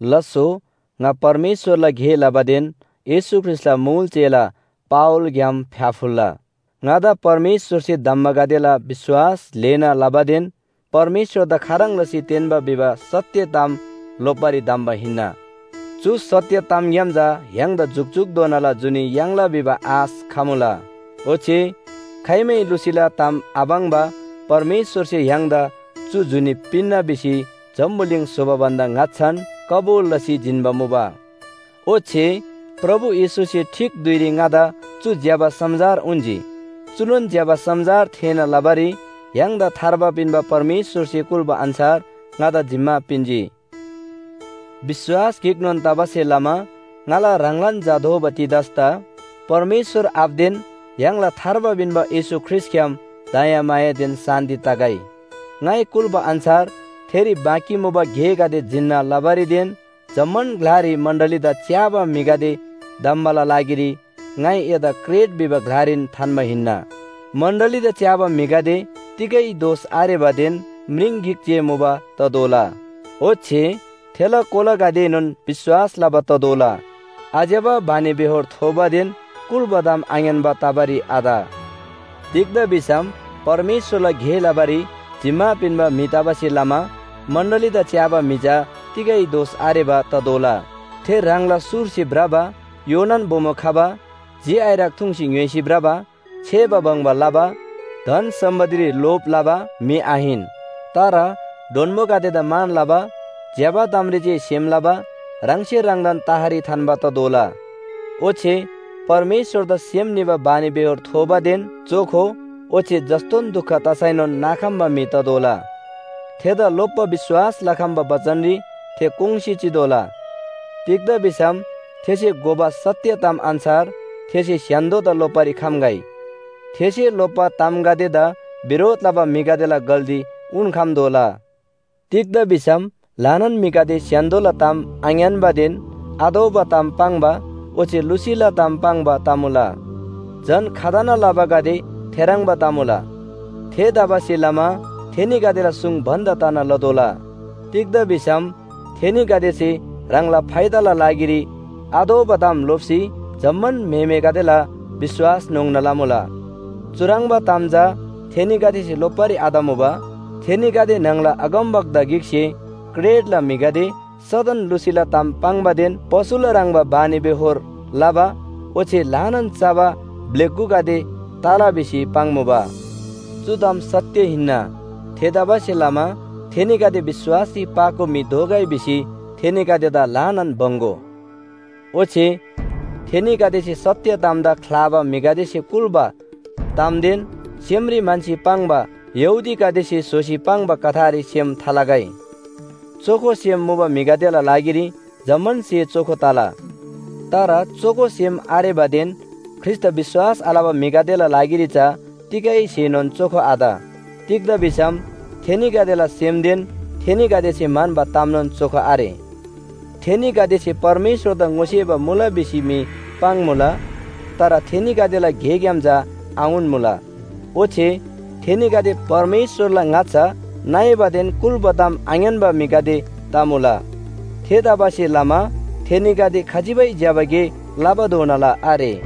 लास्‍सो ङा परमेश्‍वरला गे लबादेन येशू ख्रीष्‍टला मुल चेला पावलग्‍याम फ्‍याफुल्‍ला! ङादा परमेश्‍वरसे धम्‍बागदेला विश्‍वास ल्‍हेना लबादेन परमेश्‍वरदा खाह्रङ् लसी तेन्‍बा भिबा सत्‍य ताम लोप्‍बारी धम्‍बा हिन्‍ना। चु सत्‍य तामग्‍याम चा य्‍हाङदा जुकजुकधोनाला जुनी याङ्ला भिबा आश खमुला। ओच्‍छे खाइमै लुसीला ताम आपाङ्बा परमेश्‍वरसे य्‍हाङदा चु जुनी पिन्‍ना भिसी जम्‍बुलिङ स्‍होबा भन्‍दा ङाच्‍छान कबुल लसी जिन्‍बा मुबा। ओच्‍छे प्रभु येशूसे ठीक धुइरी ङादा चु ज्‍यबा समाचार उन्‍जी। चुनोन ज्‍यबा समाचार थेःना लबारी य्‍हाङदा थार्बा पिन्‍बा परमेश्‍वरसे कुल्‍बा अन्‍छार ङादा जिम्‍मा पिन्‍जी। विश्‍वास गिकनोन तबासे लमा ङाला ह्राङलान झा दोबा तीतसदा परमेश्‍वर आबादेन य्‍हाङदा थार्बा पिन्‍बा येशू ख्रीष्‍टग्‍याम दयामायादेन शान्‍ति तगै। ङाइ कुल्‍बा अन्‍छार थेरी बाँकी मुबा गेगदे जिन्‍ना लबारीदेन जम्‍मान ग्‍लारी मण्‍डलीदा च्‍याबा म्‍हिगदे धम्‍बाला लागिरी ङाइ एदा क्रेट भिबा ग्‍लारी थान्‍बा हिन्‍ना। मण्‍डलीदा च्‍याबा म्‍हिगदे तिगै दोष आरेबादेन म्रिङ गिक जे मुबा ततोःला। ओच्‍छे थेला कोलागदेएनोन विश्‍वास लबा ततोःला। आज्‍यबा बानीबेहोर थोबादेन कुल्‍बा ताम आङ्‌यान्‍बा तबारी आत। तिग्‍दा भिसम परमेश्‍वरला गे लबारी जिम्‍मा पिन्‍बा म्‍हि तबासे लमा मण्‍डलीदा च्‍याबा म्‍हि चा तिगै दोष आरेबा ततोःला। थे ह्राङला सुरसे भ्रबा, योनान बोमो खबा, झि आइरक थुङ्सी ङ्‌य्‍होइसी भ्रबा, छेबा बङ्बा लबा, धन सम्‍पत्तिरी लोभ लबा म्‍हि आहिन, तर डोन्‍बोगदेदा मान लबा, ज्‍यबा तामरी जे सेम लबा, ह्राङसे ह्राङदान तहरी थान्‍बा ततोःला। ओच्‍छे परमेश्‍वरदा सेम निबा बानीबेहोर थोबादेन चोखो ओच्‍छे जस्‍तोन दुख तसैनोन नाखम्‍बा म्‍हि ततोःला। थेदा लोप्‍बा विश्‍वास लखम्‍बा बचनरी थे कोङ्‌सी चितोःला। तिग्‍दा भिसम थेसे घोबा सत्‍य ताम अन्‍छार थेसे स्‍य्‍हान्‍दोदा लोप्‍बारी खम्‍गै। थेसे लोप्‍बा तामगदेदा बिरोध लबा म्‍हिगदेला गल्‍ती उन्‍खम्‍तोःला। तिग्‍दा भिसम ल्‍हानान म्‍हिगदे स्‍य्‍हान्‍दोला ताम आङ्‌यान्‍बादेन आतोःबा ताम पाङ्बा ओच्‍छे लुसीला ताम पाङ्बा तमुला, झन खतना लबागदे थेह्रङ्बा तमुला। थेतबासेलमा थेनीगदेला सुङ बन्‍द तना लतोःला। तिग्‍दा भिसम थेनीगदेसे ह्राङला फाइदाला लागिरी आतोःबा ताम लोप्‍सी जम्‍मान म्‍हेमेगदेला विश्‍वास न्‍होङ्ना लबा मुला। चुह्रङ्बा ताम चा थेनीगदेसे लोप्‍बारी आतमुबा। थेनीगदे न्‍हङला अगमवक्ता गिकसे “क्रेटला म्‍हिगदे सदन लुसीला ताम पाङ्बादेन पशुला ह्रङ्‌बा बानीबेहोर लबा ओच्‍छे ल्‍हाना चबा ब्‍लेगुगदे तला” भिसी पाङ्मुबा। चु ताम सत्‍य हिन्‍ना। थेतबासेलमा थेनीगदे विश्‍वासरी पाको म्‍हि दोगै भिसी थेनीगदेदा ल्‍हानान बङ्‍‌गो। ओच्‍छे थेनीगदेसे सत्‍य तामदा ख्‍लाबा म्‍हिगदेसे कुल्‍बा तामदेन सेमरी म्‍हन्‍सी पाङ्बा यहूदीगदेसे स्‍होसी पाङ्बा कथारी सेम थालगै। चोखो सेम मुबा म्‍हिगदेला लागिरी जम्‍मान स्‍हे चोखो तला। तर चोखो सेम आरेबादेन ख्रीष्‍टदा विश्‍वास आलबा म्‍हिगदेला लागिरी चा तिगै स्‍हेनोन चोखो आत। तिग्‍दा भिसम थेनीगदेला सेमदेन थेनीगदेसे म्‍हन्‍बा तामनोन चोखो आरे। थेनीगदेसे परमेश्‍वरदा ङोसेबा मुला भिसी मी पाङ्‌मुला, तर थेनीगदेला गेग्‍याम चा आउन्‍मुला। ओच्‍छे थेनीगदे परमेश्‍वरला ङाच्‍छा नइबादेन कुल्‍बा ताम आङ्‌यान्‍बा म्‍हिगदे तमुला। थेतबासेलमा थेनीगदे खजिबै ज्‍यबा गे लबाधोनाला आरे।